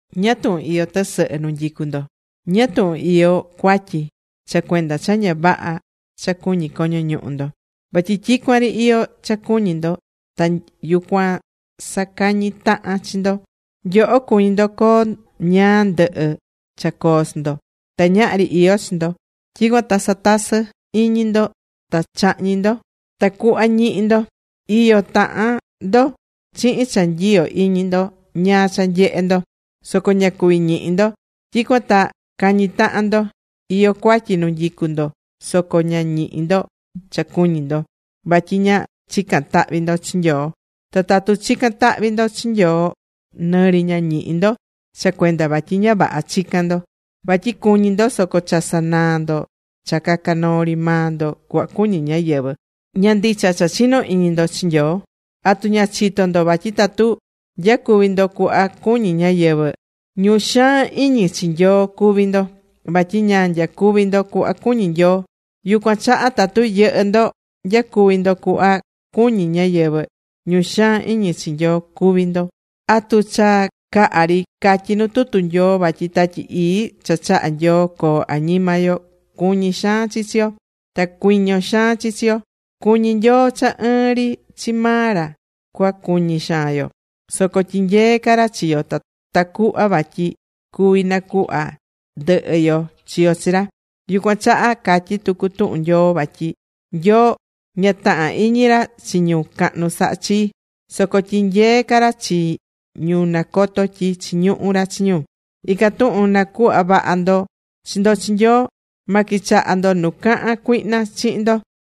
¿Ñáá tuhun iyó tɨsɨhɨ nu nyicu ndo? ¿Ñáá tuhun iyó cuatyi? Cha cuenda cha ña vaha cha cuñí coño ñuhu ndo. Vatyi tyicuan ri iyó cha cuñi ndo ta yucuan sacañí tahan chi ndo. Nyoho cuñí ndo coo ñáá ndɨhɨ cha coo chi ndo. Ta ñahri iyó chi ndo. Tyicuan ta satasɨ́ iñi ndo ta chahñí ndo tacuhva ñihi ndo. Iyo tahan ndo chihin cha nyiyo iñi ndo ñáá cha nyehé ndo soco ña cuví ñihi ndo. Tyicuan ta cañí tahan ndo. Iyó cuatyi nu nyicú ndo soco ña ñihí ndo cha cuñí ndo. Vatyi ña chicán tahvi ndo chi Nyoo. Ta tatu chicán tahvi ndo chi Nyoo, nɨ ri ña ñihí ndo cha cuenda vatyi ña vaha chicán ndo. Vatyi cuñí ndo soco cha sanaa ndo cha caca noo ri maa ndo cuhva cuñí ñáyɨvɨ. Ña ndicha cha chinó iñi ndo chi Nyoo. ¿Atu ña chitó ndo vatyi tatu nyacuví ndo cuhva cuñí ñáyɨvɨ, ñu xaan iñi chi Nyoo cuví ndo vatyi ña nyacuví ndo cuhva cuñí Nyoo? Yucuan chaha tatu yɨhɨ ndo nyacuví ndo cuhva cuñí ñáyɨvɨ, ñu xaan iñi chi Nyoo cuví ndo. ¿Atu cha caha ri catyí nu tutu Nyoo vatyi Tatyi Ii cha chahá Nyoo coo añima yo, cuñí xaan chi chi yo, ta cuiño xaan chi chi yo? Cuñí Nyoo cha ɨɨn ri chi maa ra cua cuñi xaan yo. Soco tyinyeé ca ra chi yo tacuhva vatyi cuvi nacuhva ndɨhɨ yo chi yo chi ra. Yucuan chaha catyí tucu tuhun Nyoo vatyi Nyoo ña tahán iñi ra chi ñu cahnu saha chii. Soco tyinyeé ca ra chi ñu nacotó tyi chiñuhu ra chi ñu. Ican tuhun na̱cuhva vaha ndo chi ndo chi Nyoo. Ma quichaha ndo nu cahán cuihna chihin ndo.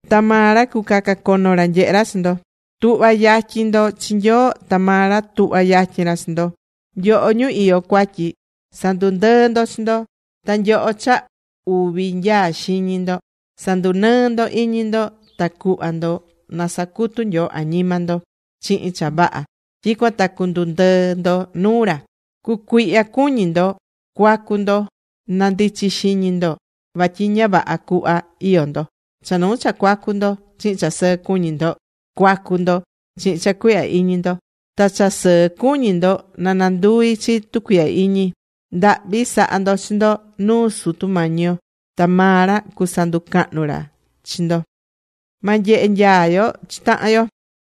Ta maa ra cucacacono ra nyehe ra chi ndo. Tu̱hva yatyin ndo chi Nyoo ta maa ra tuhva yatyin ra chi ndo. Nyoho ñu iyó cuatyi, sa̱ndundɨɨ ndo chi ndo. Ta nyoho cha uvi nyaa xiñi ndo sa̱ndunɨɨ ndo iñi ndo ta cu̱hva ndo na sacutu Nyoo añima ndo chihin cha vaha, tyicuan ta cundundɨɨ ndo nuu ra. Cu̱cuihya cuñi ndo. Cuacu ndo. Na ndichi xiñi ndo vatyi ña vaha cuhva iyó ndo. Cha nuu cha cuacu ndo chihin cha sɨɨ cuñi ndo cuacu ndo chihin cha cuihya iñi ndo. Ta cha sɨɨ cuñi ndo na nanduvi chi tucuihya iñi. Ndahvi sa̱ha ndo chi ndo nuu Sutu Mañi yo, ta maa ra cusanducahnu ca ra chi ndo.Ma nyehe nyaa yo chi tahan yo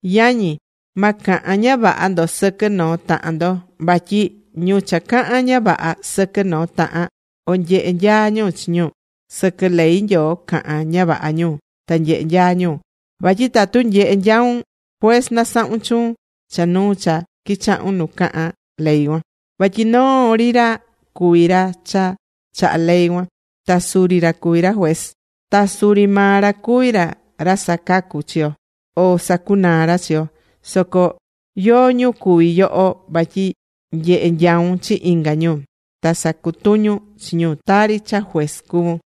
Yañi, ma cahan ña vaha ndo sɨquɨ noo tahan ndo. Vatyi ñu cha cahán ña vaha sɨquɨ noo tahan, o nyehé nyaa ñu chi ñu, sɨquɨ ley Nyoo cahán ña vaha ñu ta nyehé nyaa ñu. Vatyi tatu nyehe nyaun, juez nasahún chuun cha nuu cha quichahún nu cahán ley cuan. Vatyi noo ri ra cuví ra cha chahá ley cuan. Ta suri ra cuví ra juez. Ta suri maa ra cuví ra ra sacacu chi yo, o sacunaa ra chi yo. Soco ¿yóó ñu cuví yoho vatyi nyehe nyaun chi inga ñu, ta sacutuñun chi ñu tari cha juez cuvún?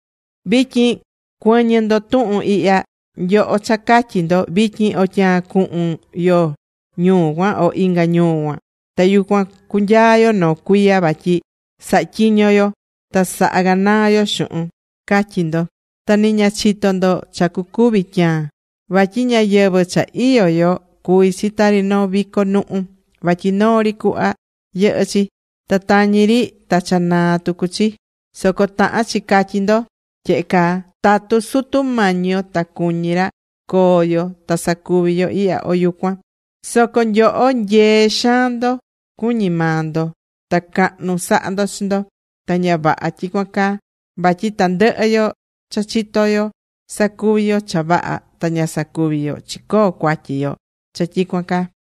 Vityin cuɨ̱ñɨ ndo tuhun ihya, nyoho cha catyí ndo: “Vityin o tyaan cuhun yo ñuu cuan, o inga ñuu cuan. Ta yucuan cunyaa yo noo cuiya vatyi sahatyiño yo ta saha ganaa yo xuhun”, catyí ndo. Ta ni ña chitó ndo cha cucuvi tyaan. Vatyi ñayɨvɨ̱ cha iyó yo cuví chi tari noo vico nuhu vatyi noo ri cuhva yɨhɨ chi, ta tañi ri ta cha naa tucu chi. Soco tahán chi catyí ndo tyehe caa: “Tatu Sutu Mañi yo ta cuñí ra, coo yo ta sacuvi yo ihya o yucuan.” Soco nyoho nyee xaan ndo cuñí maa ndo ta cahnu sahá ndo chi ndo. Ta ña vaha tyicuan caa. Vatyi tandɨhɨ yo cha chitó yo sacuví yo cha vaha ta ña sacuví yo, chicoó cuatyi yo cha tyicuan caa.